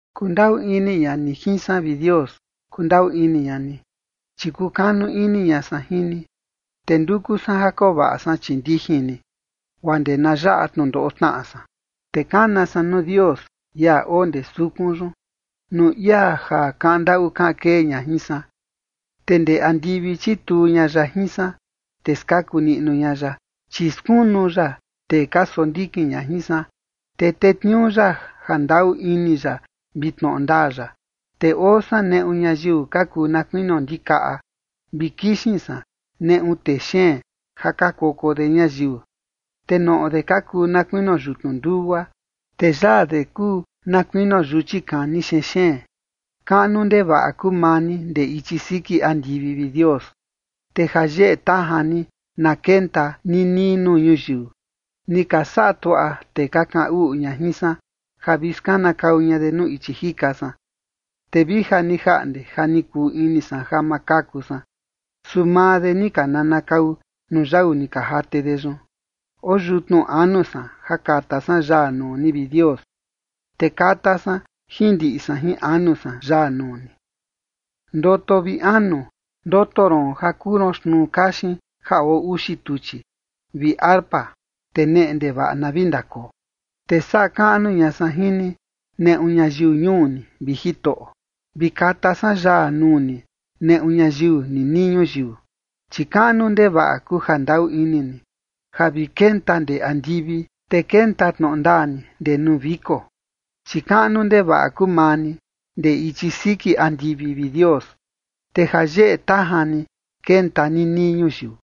Kundaꞌu ini ña ni jin san, vi Dios. Kundaꞌu ini ña ni, chi kukanu ini ña san jin ni, te nduku san ja koo vaꞌa san chii ndijin ni, guaa ndee na yaꞌa tnundoꞌo tnaꞌa san. Te kana san nuu Dios, ia oo ndee sukun yun, nuu ia ja kaꞌan ndaꞌu kaꞌan kee ña jin san. Te ndee andivi chituu ña ya jin san, te skaku niꞌnu ña ya, chi skunu ya tee ka sondikin ña jin san. Te tetniuu ya jandaꞌu ini ya vi tnoꞌo ndaa ya. Te oo san neꞌu ñayiu ka kuu na kuinio ndikaꞌa vi kixin san neꞌu tee xeen ja ka koko de ñayiu. Te noꞌo de ka kuu na kuinio yutnu ndugua, te yaa de kuu na kuinio yuchi kani xeen xeen. Kaꞌnu ndevaꞌa kuu maa ni ndee ichi siki andivi, vi Dios. Te jayeꞌe tajan ni na kenta ninii nuu ñuyiu. Ni ka saꞌa tuaꞌa tee ka kaꞌan uꞌu ña jin san ja vi skanakau ña de nuu ichi jika san, te vi ja ni jaꞌnde ja ni kuu ini san ja ma kaku san, su maa de ni ka nanakau nuu yau ni ka jate de yun. Oo yutnu anu san ja kata san yaa nuu ni, vi Dios, te kata san jin ndiꞌi san jin anu san yaa nuu ni. Ndoto, vi anu. Ndoto ron ja kuu ron xtnuu kaxin ja oo uxi tuchi, vi arpa, te neꞌe ndevaꞌa na vi ndakoo. Te saꞌa kaꞌnu ña san jin ni, neꞌu ñayiu ñuu ni, vi Jitoꞌo, vi kata san yaa nuu ni neꞌu ñayiu ninii ñuyiu. Chi kaꞌnu ndevaꞌa kuu jandaꞌu ini ni, ja vi kenta ndee andivi, te kenta tnoꞌo ndaa ni ndee nuu viko. Chi kaꞌnu ndevaꞌa kuu maa ni ndee ichi siki andivi, vi Dios, te jayeꞌe tajan ni kenta ninii ñuyiu.